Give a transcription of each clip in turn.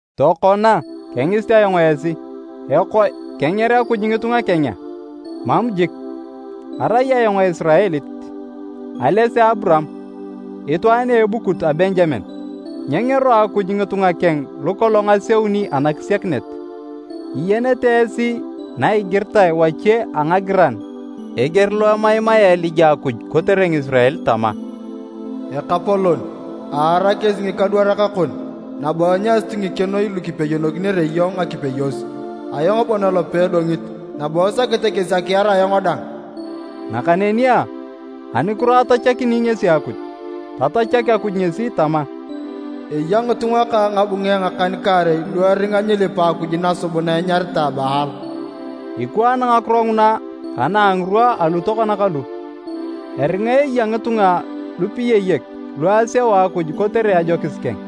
Tokona, kengisit ayong esi, “Ekoe kenger Akuj ngitunga keng a?” Mam jik! Arai ayong Esiraelit, ales a Aburaam, itwaan a ebukut a Benjamen. Nyengero Akuj ngitunga keng lukolong aseuni anakisiakinet. Iyenete esi na igiritae wache a ngagiran eger lo emaimaea Elija Akuj kotere Ngisirael tama, “Ekapolon, aar kesi ngikadwarak kon, nabo enyasut ngikenoi lu kipeyokinere iyong ngakipeyos. Ayong bon elope edongit, nabo esakete kesi akiar ayong dang.” Nakaneni a, anukiro atachakini ngesi Akuj? Tatachak Akuj ngesi tama, “Eya ngitunga kang ngabunge ngakan-kaarei lu eringa nyilipa akuj nasubuna enyaritae Baal.” Ikwaan ngakiro nguna ka na a ngirwa alu tokona kalu. Eringa eya ngitunga lupiyayek lu aseu Akuj kotere ajokis keng.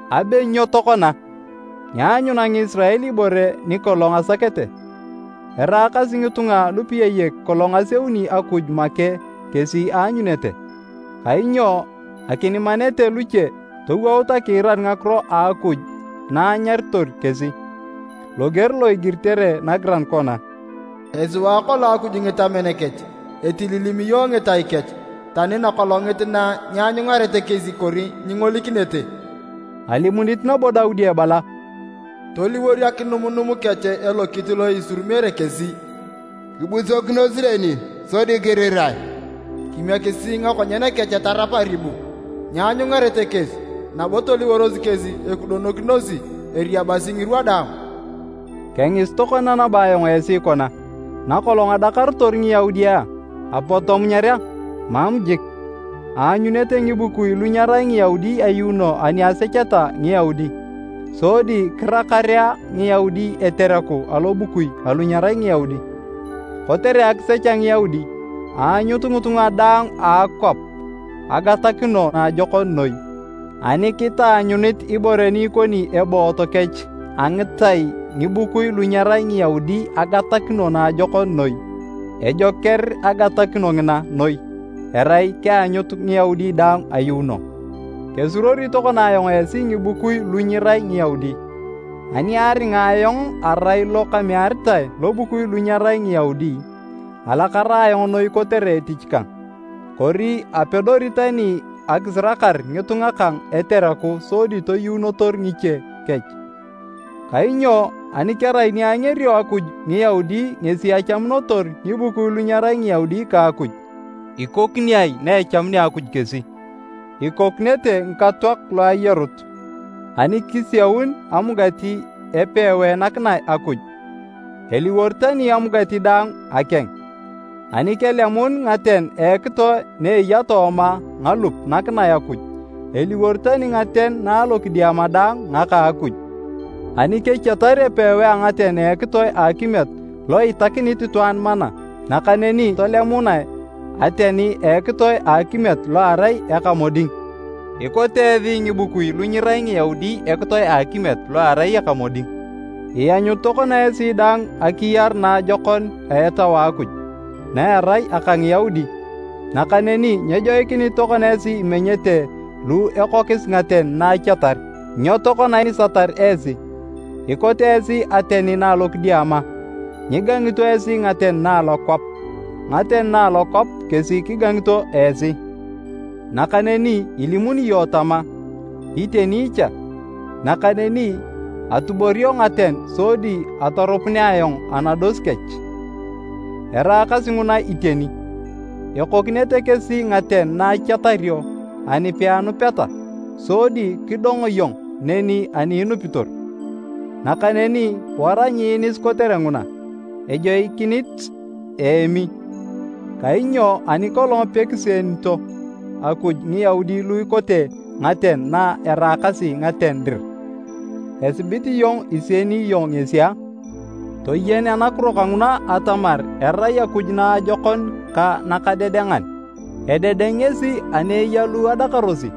Abe nyo tokona? Nyeanyuna Ngisirael ibore ni kolong asakete. Eraakasi ngitunga lupiyayek kolong aseuni Akuj make kesi aanyunete, kainyo akinimanete luche towout akiirar ngakiro a Akuj na anyaritor kesi. Loger lo igiritere nagiran kona, “Esiwaa kolong Akuj ngitamen kech, etililimiyo ngitai kech, tani nakolongit na, nyeanyungarete kesi kori nyingolikinete.” Alimunit nabo Daudi ebala, “Toliwor akinumnum kech elokit lo isurumi kesi, kibusokinos neni sodi kirirae! Kimiekisi ngakonyen kech tarap aribu, nyeanyungareta kesi, nabo toliworos kesi ekudonokinosi eriabasi ngirwa daang.” Kengisit tokona nabo ayong esi kona, nakolong adakarotor Ngiyaudi a, apot tomunyar a? Mam jik! Aanyunete ngibukui lu nyerai Ngiyaudi ayuuno ani asecheta Ngiyaudi. Sodi kirakarea Ngiyaudi etereku alobukui alu nyerai Ngiyaudi. Kotere akisech a Ngiyaudi, aanyut ngitunga daang a akwap agatakino naajokon noi. Ani kitaanyunit ibore ni ikoni eboot kech a ngitai ngibukui lu nyerai Ngiyaudi agatakino naajokon noi, ejoker agatakino ngina noi erai keanyut Ngiyaudi daang ayuuno! Kesuruori tokona ayong esi ngibukui lu nyirai Ngiyaudi, ani aringa ayong arai lo kamearitae lobukui lu nyerai Ngiyaudi, alakara ayong noi kotere etich kang. Kori apedori tani akisirakar ngitunga kang etereku sodi toyuunotor ngiche kech. Kainyo ani kerai ni angerio Akuj Ngiyaudi ngesi achamunotor ngibukui lu nyerai Ngiyaudi ka Akuj, ikokini ai na echamunea Akuj kesi? Ikokinete ngikatoak lu ayarut! Ani kisiaun amugati epewae nakinae Akuj, eliwor tani amugati daang akeng. Ani kelemun ngaten a ekitoe na eya tooma ngalup nakinae Akuj, eliwor tani ngaten na alokidiama dang ngaka a Akuj. Ani kechiatar epewae a ngaten a ekitoe a akimiet, lo itakinit itwaan mana, nakaneni tolemunae ateni a ekitoe a akimiet lo erai eka moding, tokodakinae nikeng, ikote esi ngibukui lu nyirai Ngiyaudi ekitoe a akimiet, lo erai eka moding. Ianyut tokona esi dang akiyar naajokon a Etau a Akuj, na erai aka Ngiyaudi. Nakaneni nyejoikinit tokona esi imenyete lu ekokis ngaten na achiatar, nyo tokona inisatar esi? Ikote esi ateni na alokidiama, nyigangito esi ngaten na alokwap, ngaten na alokwap kesi kigangito esi. Nakaneni ilimuni iyong tama, “Iteni cha, nakaneni atuborio ngaten sodi atorupunea ayong anados kech.” Eraakasi nguna iteni! Ekokinete kesi ngaten na achiatario ani peanupeta, sodi kidong iyong neni ani inupitor. Nakaneni wara nyiinis kotere nguna, ejoikinit iemi. Kainyo ani kolong pekisienito Akuj Ngiyaudi lu ikote ngaten na eraakasi ngaten dir, esibit iyong isieni iyong ngesi a? Toyen anakiro kanguna atamar erai Akuj naajokon ka nakadedengan. Ededeng ngesi ani eya lu adakarosi,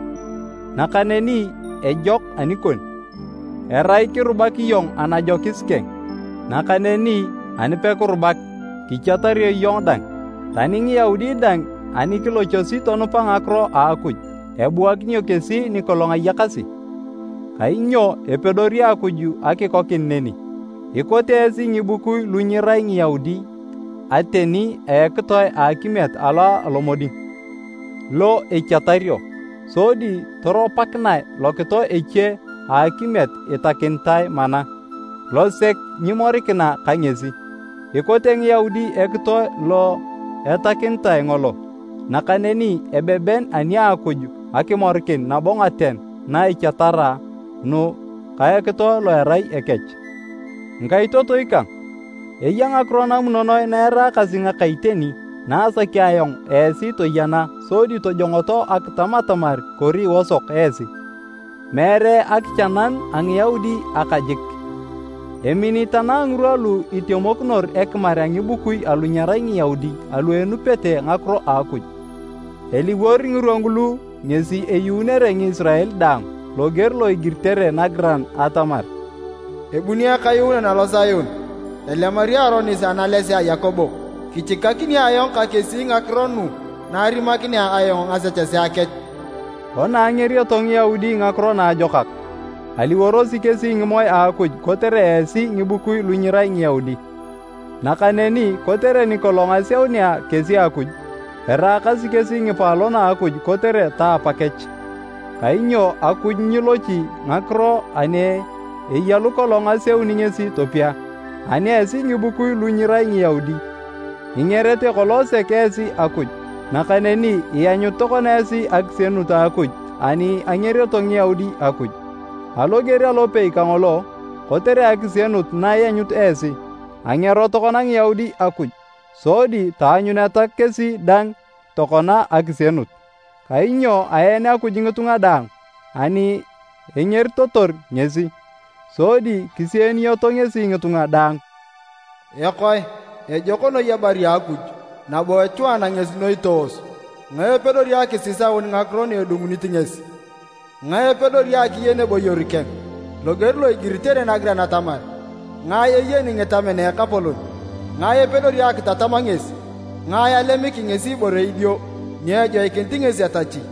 nakaneni ejok anikon, erai kirubak iyong anajokis keng. Nakaneni anipekirubak, kichiatario iyong dang. Tani Ngiyaudi dang ani kilochosi tonupa ngakiro a Akuj, ebuakinio kesi nikolong ayakasi, kainyo epedori Akuj akikokin neni. Ikote esi ngibukui lu nyirai Ngiyaudi ateni a ekitoe a akimiet alo alomoding, lo echiatario, sodi toropakinae lokitoe eche a akimiet itakinitae mana, losek nyimorikina ka ngesi. Ikote Ngiyaudi ekitoe lo etakinitae ngolo, nakaneni ebeben ani a Akuj akimorikin nabo ngaten na echiatara nu ka ekitoe lo erai ekech. Ngikaitotoi kang, eya ngakiro namunonoe na eraakasi ngaka iteni na asaki ayong esi toyena sodi tojongoto akitam atamar kori iosok esi. Meere akichananu a Ngiyaudi aka jik, emini tanang ngirwa lu itemokinor ekimar a ngibukui alu nyerai Ngiyaudi alu enupete ngakiro a Akuj. Eliwor ngirwa ngulu ngesi eyuunere Ngisirael daang. Loger lo igiritere nagiran atamar, “Ebuni Ekayuunan alo Sion, elemari aronis analesea a Yakobo. Kichikakin ayong ka kesi ngakiro nu na arimakinea ayong ngasechesea kech.” Kona angerioto Ngiyaudi Ngakiro Naajokak, aliworosi kesi ngimoe a Akuj kotere esi ngibukui lu nyirai Ngiyaudi. Nakaneni kotere nikolong aseunea kesi Akuj, eraakasi kesi ngipaalon a Akuj kotere ta apakech. Kainyo Akuj nyilochi ngakiro ani eya lukolong aseuni ngesi topia. Ani esi ngibukui lu nyirai Ngiyaudi, ingerete kolong sek esi Akuj, nakaneni ianyut tokona esi akisienut a Akuj ani angerioto Ngiyaudi Akuj. Aloger alopei kangolo, kotere akisienut na ianyut esi, angero tokona Ngiyaudi Akuj, sodi taanyuneta kesi dang tokona akisienut. Kainyo aen Akuj ngitunga daang ani engeritotor ngesi, sodi kisieniyoto ngesi ngitunga daang. Ekoe, ejok noi ebari a Akuj! Nabo echwaana ngesi noi toos! Ngae epedori akisisaun ngakiro na edungunit ngesi? Ngae epedori akiyen eboyor keng? Loger lo igiritere nagiran atamar, “Ngae eyeni ngitamen a Ekapolon? Ngae epedori akitatam ngesi? Ngae alemiki ngesi ibore idio, ni ejoikinit ngesi etachi?”